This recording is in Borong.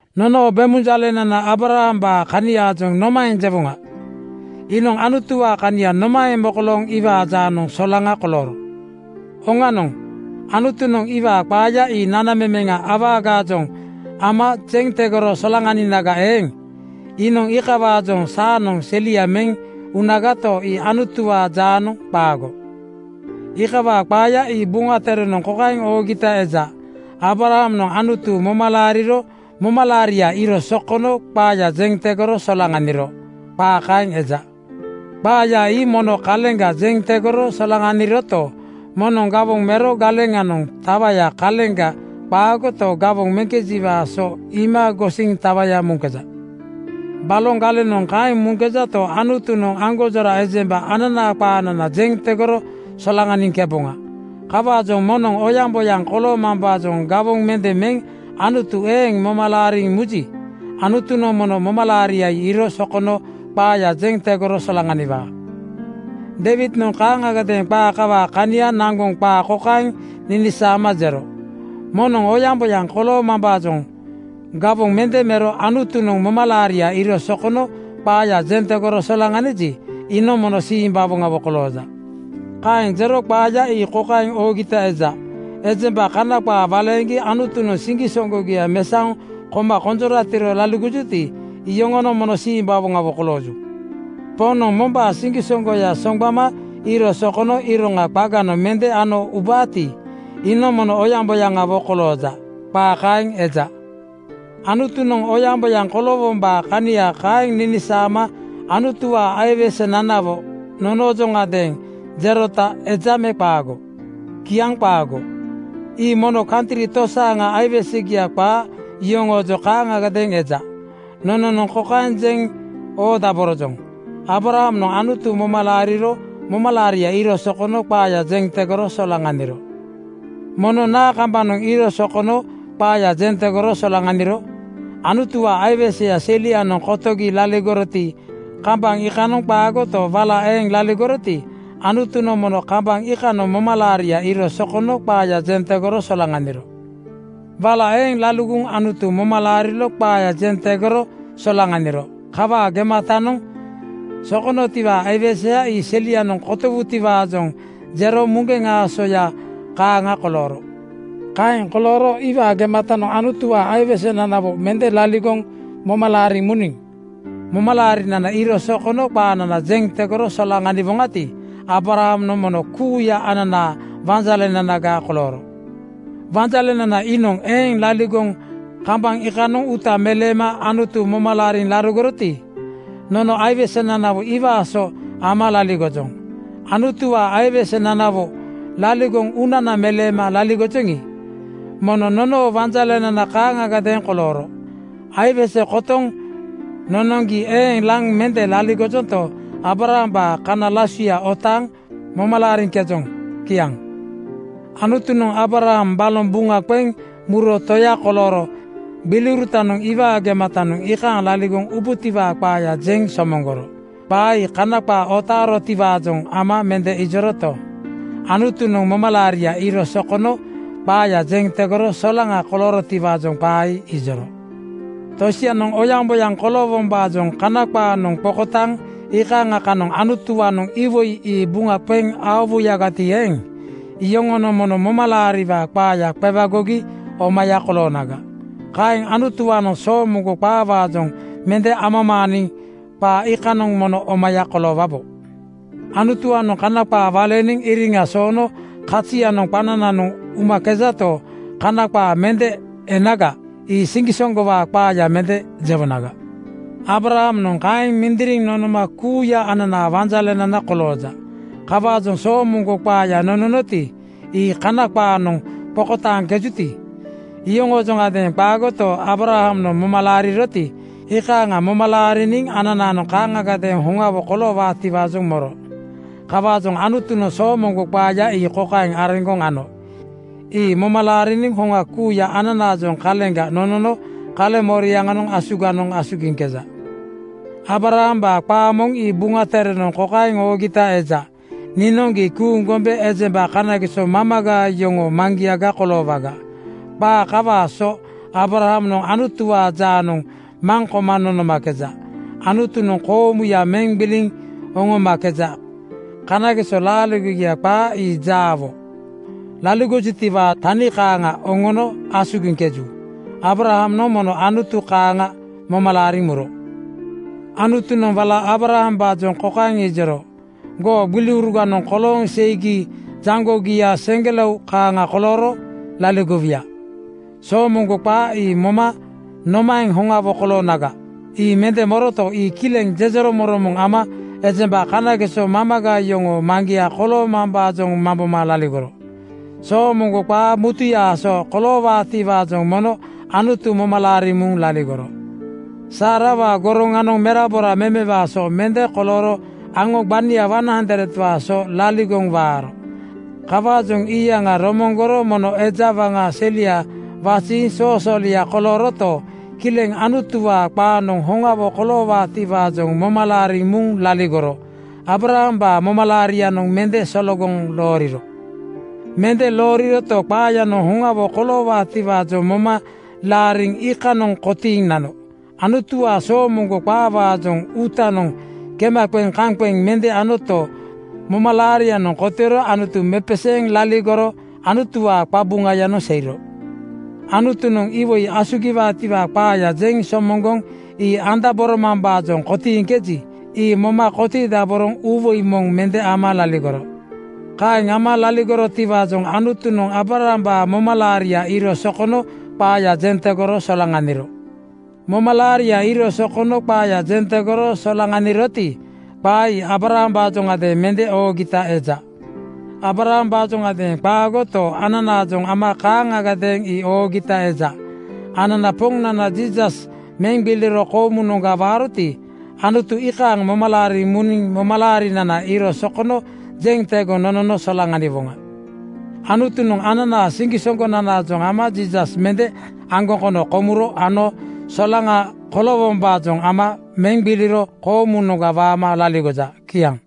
Nono bemunjalenana Aabrahambaa kaniaajoŋ nomaeŋ jewoŋa? Iinoŋ Anutuwaa kania nomaeŋ mokolooŋ iwaa jaanoŋ solaŋa kolooro? Oŋanoŋ, Anutunoŋ iwaa qaaya ii nanamemeŋa awagaajoŋ ama jeŋ tegoro solaŋaninaga eeŋ, iinoŋ iikawaajoŋ saanoŋ selia meŋ unagato, ii Anutuwaa jaanoŋ qaago. Iikawaa qaaya ii Buŋa Terenoŋ kokaeŋ oogita eja, “Aabrahamnoŋ Anutu moma laariro momalaaria iiro sokono qaaya jeŋ tegoro solaŋaniro.” Qaa kaeŋ eja. Qaaya ii mono kaleŋga jeŋ tegoro solaŋaniroto, moŋnoŋ gawoŋ mero galeŋanoŋ tawaya kaleŋga qaagoto, gawoŋ meŋkejiwaa so iima gosiŋ tawaya muŋkeja. Baloŋ galenoŋ kaeŋ muŋkejato, Anutunoŋ aŋgonjora ejemba ananaa qaanana jeŋ tegoro solaŋaniŋkeboŋa. Kawaajoŋ moŋnoŋ oyaŋboyaŋ koloomambaajoŋ gawoŋ mende meŋ Anutu eeŋ moma laariŋ muji, Anutunoŋ mono momalaaria ii iiro sokono qaaya jeŋ tegoro solaŋaniwaa. Deiwidnoŋ kaaŋagadeeŋ qaa kawaa kania naŋgoŋ qaa kokaeŋ ninisaama jero, “moŋnoŋ oyaŋboyaŋ koloomambaajoŋ gawoŋ mende mero Anutunoŋ momalaaria iiro sokono qaaya jeŋ tegoro solaŋaniji, iinoŋ mono simbawoŋawo kolooja.” Kaeŋ jero qaaya ii kokaeŋ oogita eja, “Ejemba Kana qaa waleeŋgi Anutunoŋ siŋgisoŋgogia mesaoŋ koma konjoratiro laligojuti, iyoŋonoŋ mono simbawoŋawo kolooju. Poŋnoŋ mombaa siŋgisoŋgoya soŋgbama iiro sokono iroŋa qaganoŋ mende ano ubaati, iinoŋ mono oyaŋboyaŋawo kolooja.” Qaa kaeŋ eja. Anutunoŋ oyaŋboyaŋ koloowombaa kania kaeŋ ninisaama Anutuwaa aiwesenanawo nonoojoŋadeeŋ jerota eja me qaago? Kiaŋ qaago. Ii mono kantri tosaaŋa aiwesegia qaa yoŋoojoŋ kaaŋagadeeŋ eja. Nononoŋ kokaeŋ jeŋ oodaborojoŋ, “Aabrahamnoŋ Anutu moma laariro momalaaria iiro sokono qaaya jeŋ tegoro solaŋaniro.” Mono naa kambanoŋ iiro sokono qaaya jeŋ tegoro solaŋaniro? Anutuwaa aiweseya selianoŋ kotogi laligoroti, kambaŋ iikanoŋ qaagoto, wala eeŋ laligoroti, Anutunoŋ mono kambaŋ iikanoŋ momalaaria iiro sokono qaaya jeŋ tegoro solaŋaniro. Wala eeŋ laligoŋ Anutu moma laariro qaaya jeŋ tegoro solaŋaniro. Kawaa gematanoŋ sokonotiwaa aiweseya ii selianoŋ kotowutiwaajoŋ jero muŋgeŋ aasoya kaaŋa kolooro. Kaeŋ kolooro iwaa gematanoŋ Anutuwaa aiwesenanawo mende laligoŋ moma laariŋ muniŋ momalaarinana iiro sokono qaanana jeŋ tegoro solaŋaniwoŋati, Aabrahamnoŋ kuuya ananaa wanjalenanaga kolooro. Wanjalenana iinoŋ eeŋ laligoŋ kambaŋ iikanoŋ uuta meleema Anutu moma laariŋ laligoroti, nono aiwesenanawo iwaa so ama laligojoŋ. Anutuwaa aiwesenanawo laligoŋ uunana meleema laligojoŋi, mono nonoo wanjalenana kaaŋagadeeŋ kolooro. Aiwese kotoŋ nonoŋgi eeŋ laŋ mende laligojonto, Aabrahambaa kana lasuya otaaŋ moma laariŋkejoŋ. Kiaŋ. Anutunoŋ Aabraham baloŋ buŋa qeŋ muro toya kolooro gbiliurutanoŋ iwaa gematanoŋ iikaaŋ laligoŋ ubutiwaa qaaya jeŋ somoŋgoro. Qaa ii Kana qaa otaarotiwaajoŋ ama mende ijoroto, Anutunoŋ momalaaria iiro sokono qaaya jeŋ tegoro solaŋa koloorotiwaajoŋ qaa ii ijoro. Tosianoŋ oyaŋboyaŋ koloowombaajoŋ Kana qaanoŋ qokotaaŋ iikaaŋa kanoŋ Anutuwaanoŋ iwoi ii buŋa qeŋ aowuyagati eeŋ, iyoŋonoŋ mono momalaariwaa qaaya qewagogi omaya koloonaga. Kaeŋ Anutuwaanoŋ soomoŋgo qaawaajoŋ mende amamaaniŋ qaa iikanoŋ mono omaya koloowabo. Anutuwaanoŋ Kana qaa waleeniŋ iriŋa soono kazianoŋ qanananoŋ umakejato, Kana qaa mende enaga, ii siŋgisoŋgowaa qaaya mende jewonaga. Aabrahamnoŋ kaeŋ mindiriŋ nonoma kuuya ananaa wanjalenana kolooja. Kawaajoŋ soomoŋgo qaaya nononoti, ii Kana qaanoŋ qokotaaŋkejuti, iyoŋoojoŋadeeŋ qaagoto, Aabrahamnoŋ moma laariroti, iikaaŋa moma laariniŋ ananaanoŋ kaaŋagadeeŋ hoŋawo koloowaatiwaajoŋ moro. Kawaajoŋ Anutunoŋ soomoŋgo qaaya ii kokaeŋ areŋgoŋ ano: Ii moma laariniŋ hoŋa kuuya ananaajoŋ kaleŋga nonono kaleŋmoriaŋanoŋ asuganoŋ asugiŋkeja. Aabrahambaa qaa moŋ ii Buŋa Terenoŋ kokaeŋ oogita eja, “Niinoŋ gii kuuŋ gombe ejemba kanageso mamaga yoŋoo maŋgiaga koloowaga.” Qaa kawaa so Aabrahamnoŋ Anutuwaa jaanoŋ maŋ koma nonomakeja. Anutunoŋ koomuya meŋ gbiliŋ oŋomakeja. Kanageso laaligogia qaa, ii jaawo laligojutiwaa tani kaaŋa oŋoono asugiŋkeju. Aabrahamnoŋ mono Anutu kaaŋa moma laariŋ muro. Anutunoŋ wala Aabrahambaajoŋ kokaeŋ ijoro, “Goo gbiliuruganoŋ kolooŋ seigi jaŋgogia seŋgelao kaaŋa kolooro laligowuya.” Soomoŋgo qaa ii moma nomaeŋ hoŋawo koloonaga, ii mende moroto, ii kileŋ jejeromoŋromoŋ ama ejemba kanageso mamaga yoŋoo maŋgia koloomambaajoŋ mamboma laligoro. Soomoŋgo qaa mutuyaa so koloowaatiwaajoŋ mono Anutu moma laariŋ muŋ laligoro. Saarawaa goroŋanoŋ merabora memewaa so mende kolooro aŋo gbania 100:waa so laligoŋ waaro. Kawaajoŋ iyaŋa romoŋgoro mono eja waŋa selia waziiŋ soosoolia kolooroto, kileŋ Anutuwaa qaanoŋ hoŋawo koloowaatiwaajoŋ moma laariŋ muŋ laligoro Aabrahambaa momalaarianoŋ mende sologoŋ looriro. Mende looriroto, qaayanoŋ hoŋawo koloowaatiwaajoŋ moma laariŋ iikanoŋ kotiiŋ nano. Anutuwaa soomoŋgo qaawaajoŋ uutanoŋ kema qeŋ kaŋ qeŋ mende anoto, momalaarianoŋ kotiiro Anutu mepeseeŋ laligoro Anutuwaa qabuŋayanoŋ seiro. Anutunoŋ iwoi asugiwaatiwaa qaaya jeŋ somoŋgoŋ ii andaboromambaajoŋ kotiiŋkeji, ii moma kotiidaboroŋ uuwoi moŋ mende ama laligoro. Kaeŋ ama laligorotiwaajoŋ Anutunoŋ Aabrahambaa momalaaria iiro sokono qaaya jeŋ tegoro solaŋaniro. Momalaaria iiro sokono qaaya jeŋ tegoro solaŋaniroti, qaa ii Aabrahambaajoŋadeeŋ mende oogita eja. Aabrahambaajoŋadeeŋ qaagoto, ananaajoŋ ama kaaŋagadeeŋ ii oogita eja. Anana Poŋnana Jiisas meŋ gbiliro koomunoŋga waaroti, Anutu iikaaŋ moma laariŋ muniŋ momalaarinana iiro sokono jeŋ tegoŋ nonono solaŋaniwoŋa. Anutunoŋ ananaa siŋgisoŋgonanaajoŋ ama Jiisas mende aŋgoŋ kono komuro ano solaŋa koloowombaajoŋ ama meŋ gbiliro koomunoŋga waama laligoja. Kiaŋ.